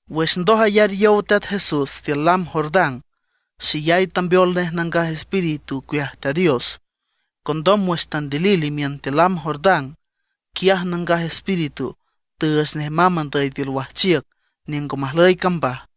Wüx ndoj ayar yow Teat Jesús tiül lam Jordán, xeyay tambeol nej Nangaj Espíritu ocueaj Teat Dios. Condom wüx tandilil imiün tiül lam Jordán, quiaj Nangaj Espíritu tüüch nej mamb andüy tiül wajchiüc niüng ngo majlüy cambaj.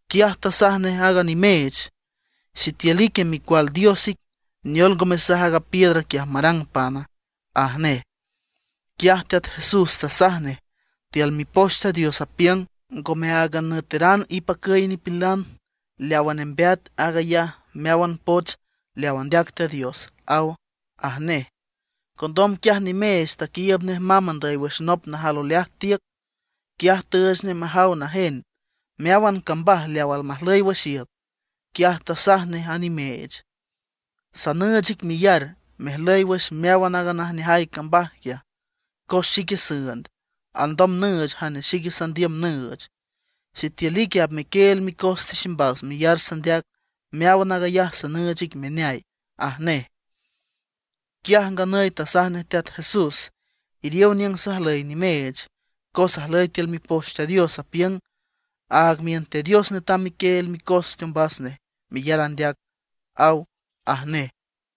Quiaj tasaj nej a nimeech: ―Sitiül ique Micual Dios ic, ¿neol ngo mesaj aaga piedra quiaj marang pana? ―aj nej. Quiaj Teat Jesús tasaj nej: ―Tiül Mipoch Teat Dios apiüng: “Ngome áagan nüeteran ipacüy nipilan; leawa nembeat, aag ayaj meáwan poch leaw andeac Teat Dios”, aw ―aj nej. Condom quiaj nimeech taquiiüb nej mamb andüy wüx nop najal oleaj tiüc. Quiaj tüüch nej majaw najen meáwan cambaj leaw almajlüy wüx iüt. Quiaj tasaj nej a nimeech: ―Sanüüch ic meyar mejlüy wüx meáwan aaga najneajay cambaj quiaj, cos xique süünd, alndom nüüch jane xic sandiüm nüüch. Sitiül ique apmequieel micos tiximbas meyar sandeac, meáwan aag ayaj sanüüch ic meneay ―aj nej. Quiaj nganüy tasaj nej Teat Jesús: ―Iriow niüng sajlüy nimeech, cos ajlüy tiül Mipoch Teat Dios, apiüng: “Aag miün Teat Dios netam mequieel micos teombas nej meyar andeac”, aw ―aj nej.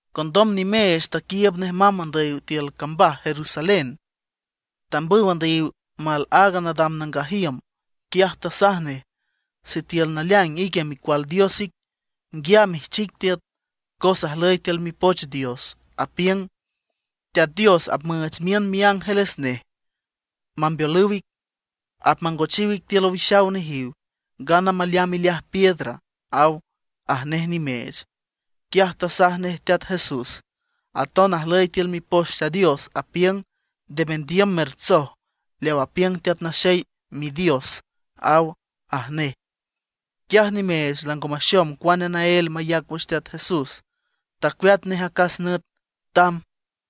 Condom nimeech taquiiüb nej mamb andüy tiül cambaj Jerusalén, tambüw andüyiw mal aaga nadam nangaj iüm. Quiaj tasaj nej: ―Sitiül naleaing ique Micual Dios ic, nguiam ijchic tiüt; cos ajlüy tiül Mipoch Dios, apiüng: Teat Dios apmüüch miün miángeles nej mambeolüw ic. Apmangochiw ic tiül owixaw nejiw, ngana maleamb ileaj piedra, aw ―aj nej nimeech. Quiaj tasaj nej Teat Jesús: ―Aton ajlüy tiül Mipoch Teat Dios, apiüng: “Nde mendiüm mertsoj leaw apiüng Teat Naxey Midios”, aw ―aj nej. Quiaj nimeech lango maxom cuane naél mayac wüx Teat Jesús; tacueat nej acas nüt, tamb.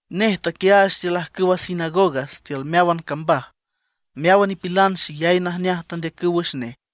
Nej taquiaach tiül ajcüwa sinagogas tiül meáwan cambaj; meáwan nipilan xeyay najneaj tandeacüw wüx nej.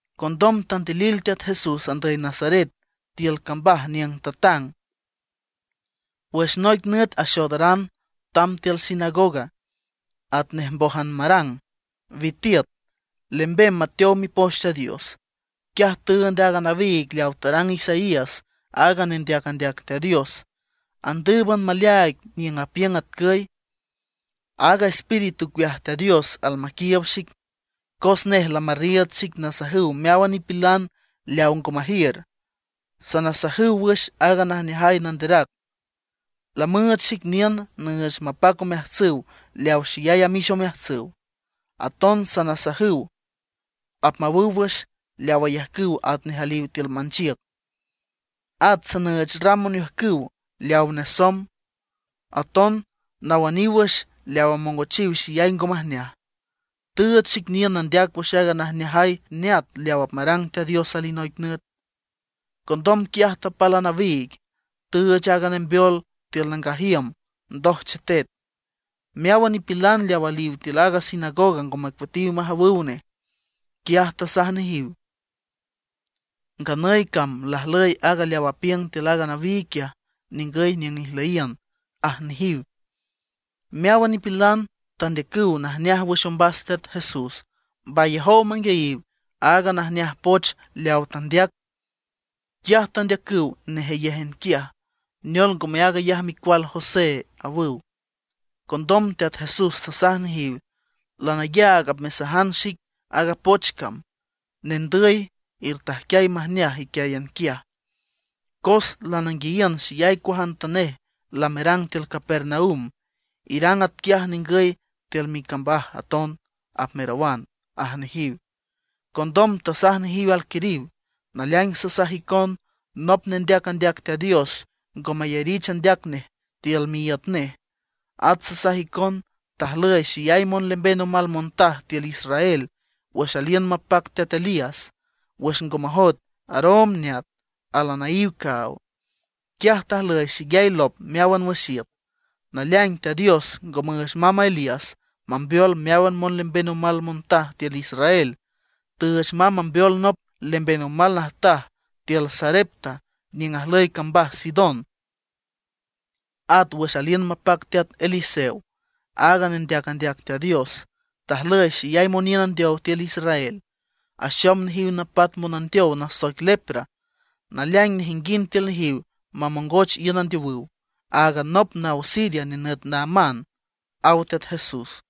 Condom tandilil Teat Jesús andüy Nazaret, tiül cambaj niüng tatang. Wüx noic nüt axoodaran tamb tiül sinagoga atnej mbójan marang, witiüt, lembem mateow Mipoch Teat Dios. Quiaj tüünd aaga nawiig leawa tarang Isaías, aaga nendeac andeac Teat Dios. Andǘüban maleaaig niüng apiüng atcüy: Aaga Espíritu ocueaj Teat Dios almaquiiüb xic, cos nej lamarriiüd xic nasajüw meáwan nipilan leaw ngo majiür, nasajüw wüx aaga najneajay nanderac. Lamüüch xic niün nüüch mapac omeajtsüw leawa xeyay amix omeajtsüw. Aton nasajüw apmawüw wüx leaw ayajcüw atnej aliw tiül manchiüc. At nüüch ram oniüjcüw leawa nesomb, aton nawüniw wüx leaw amongochiw xeyay ngo majneaj. Tüüch xic niün nandeac wüx aaga najneajay neat leaw apmarang Teat Dios alinoic nüt. Condom quiaj tapal a nawiig, tüüch aaga nembeol tiül nangaj iüm, ndoj chetet. Meáwan nipilan leaw aliw tiül a sinagoga ngo macueatiw majawüw nej. Quiaj tasaj nejiw: ―Nganüy cam lajlüy aaga leaw apiüng tiül a nawiig quiaj ningüy niüng ijlüyiün ―aj nejiw. Meáwan nipilan tandeacüw najneaj wüx ombas Teat Jesús, mbayajow manguiayiw aaga najneaj poch leawa tandeac. Quiaj tandeacüw nejeyéjan quiaj: ―¿Neol, ngome aag ayaj micual José? ―awüw. Condom Teat Jesús tasaj nejiw: ―Lanayaag apmesajan xic aaga poch cam: “Nendüy, ertajquiay majneaj iquiáyan quiaj; cos lananguiayiün xeyay cuajantanej lamerang tiül Capernaum, irang atquiaj ningüy tiül micambaj aton”, apmerawan ―aj nejiw. Condom tasaj nejiw alquiriw: ―Naleaing sasaj icon, nop nendeac andeac Teat Dios ngo mayarich andeac nej tiül miíüt nej. At sasaj icon, tajlüy xeyay monlemben omal montaj tiül Israel wüx aliün mapac teat Elías, wüx ngo majoet aroom neat al anaíw caaw. Quiaj tajlüy xeyay lop meáwan wüx iüt. Naleaing Teat Dios ngo müüch mamb a Elías mambeol meáwan monlemben omal montaj tiül Israel, tüüch mamb mambeol nop lemben omal najtaj tiül Sarepta niüng ajlüy cambaj Sidón. At wüx aliün mapac teat Eliseo, aaga nendeac andeac Teat Dios, tajlüy xeyay moniün andeow tiül Israel, axom nejiw napat monandeow nasoic lepra. Naleaing nejinguind tiül nejiw mamongoch iün andeowüw, áagan nop naw Siria nenüt Naamán ―aw Teat Jesús.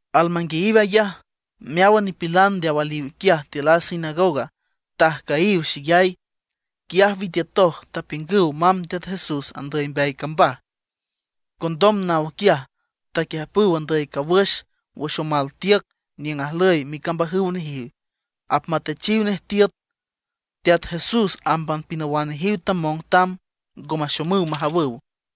Almanguiayiw ayaj, meáwan nipilan leaw aliw quiaj tiül a sinagoga tajcüyiw xeyay. Quiaj witiütoj, taquiüjpüw mamb Teat Jesús andüy mbeay cambaj. Condom naw quiaj taquiüjpüw andüy cawüx wüx omal tiüc niüng ajlüy micambajüw nejiw, apmatechiw nej tiüt. Teat Jesús ámban pinawan nejiw tamong tamb, ngo maxomüw majawüw.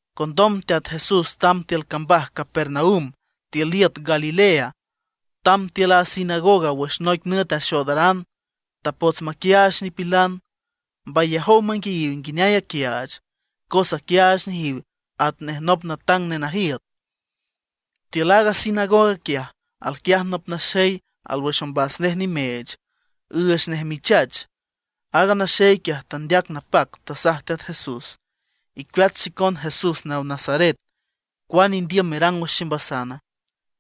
Condom Teat Jesús tamb tiül cambaj Capernaum tiül iüt Galilea. Tamb tiül a sinagoga wüx noic nüt axoodaran, tapots maquiaach nipilan. Mbayajow manguiayiw nguineay aquiaach, cos aquiaach nejiw atnej nop natang nenajiüt. Tiül aaga sinagoga quiaj, alquiaj nop naxey alwüx ombas nej nimeech, üüch nej michach. Aaga naxey quiaj tandeac napac, tasaj Teat Jesús: ―¡Icueat xicon Jesús naw Nazaret! ¿Cuane indiüm merang wüx ximbasana?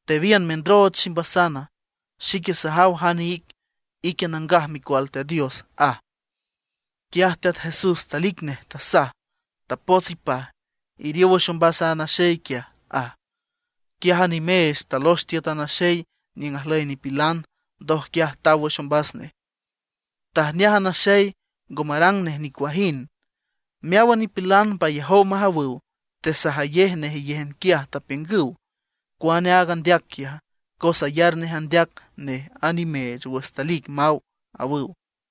¿Tewiün mendrooch ximbasana? Xique sajaw jane ic. Ique Nangaj Micual Teat Dios ―aj. Quiaj Teat Jesús talic nej, tasaj: ―¡Tapots ipaj, iriow wüx ombas a naxey quiaj! ―aj. Quiaj a nimeech talox tiüt a naxey niüng ajlüy nipilan, ndoj quiaj taw wüx ombas nej. Tajneaj a naxey, ngo marang nej nicuajind. Meáwan nipilan mbayajow majawüw, tesajayej nejeyéjan quiaj, tapiüngüw: ―¿Cuane aag andeac quiaja? cos ayar nej andeac nej a nimeech wüx talic maw ―awüw.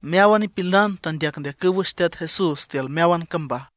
Meáwan nipilan tandeacndeacüw wüx Teat Jesús tiül meáwan cambaj.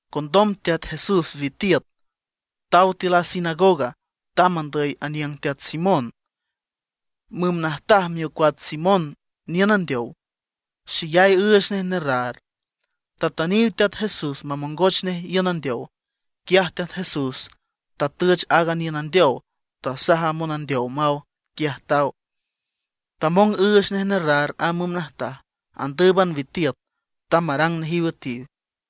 Condom Teat Jesús witiüt taw tiül a sinagoga, tamb andüy aniüng teat Simón. Müm najtaj miocuats Simón niün andeow, xeyay üüch nej nerraar. Tatüniw Teat Jesús mamongoch nej iün andeow. Quiaj Teat Jesús tatüch aaga niün andeow, tasaj a monandeow maw; quiaj taw, tamong üüch nej nerraar a müm najtaj. Andǘüban witiüt, tamb marang nejiw üetiw.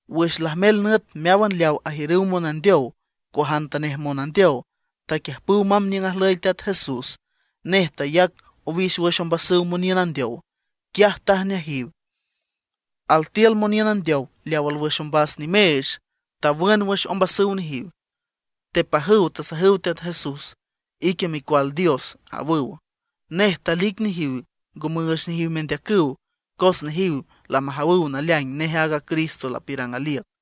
Wüx lajmel nüt meáwan leaw ajiürüw monandeow, cuajantanej monandeow, taquiüjpüw mamb niüng ajlüy Teat Jesús. Nej tayac owix wüx ombasüw moniün andeow, quiaj tajneajiw. Altiül moniün andeow leaw alwüx ombas nimeech, tawün wüx ombasüw nejiw. Tepajüw tasajüw Teat Jesús: ―¡Ique Micual Dios! ―awüw. Nej talic nejiw, ngo müüch nejiw mendeacüw, cos nejiw lamajawüw naleaing nej aaga Cristo lapiürang aliüc.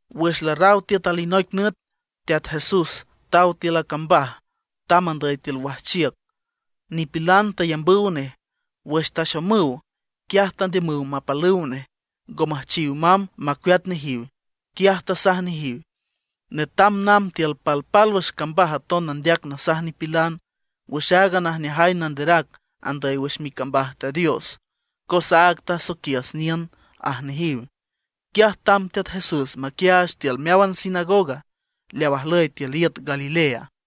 Wüx larraw tiüt alinoic nüt Teat Jesús taw tiül a cambaj, tamb andüy tiül wajchiüc. Nipilan tayambüw nej. Wüx taxomüw, quiaj tandiümüw mapalüw nej, ngo müjchiw mamb macueat nejiw. Quiaj tasaj nejiw: ―Netam namb tiül palpálwüx cambaj aton nandeac nasaj nipilan wüx aaga najneajay nanderac andüy wüx micambaj Teat Dios, cos áag tasoiquiüs niün ―aj nejiw. Quiaj tamb Teat Jesús maquiaach tiül meáwan sinagoga leaw ajlüy tiül iüt Galilea.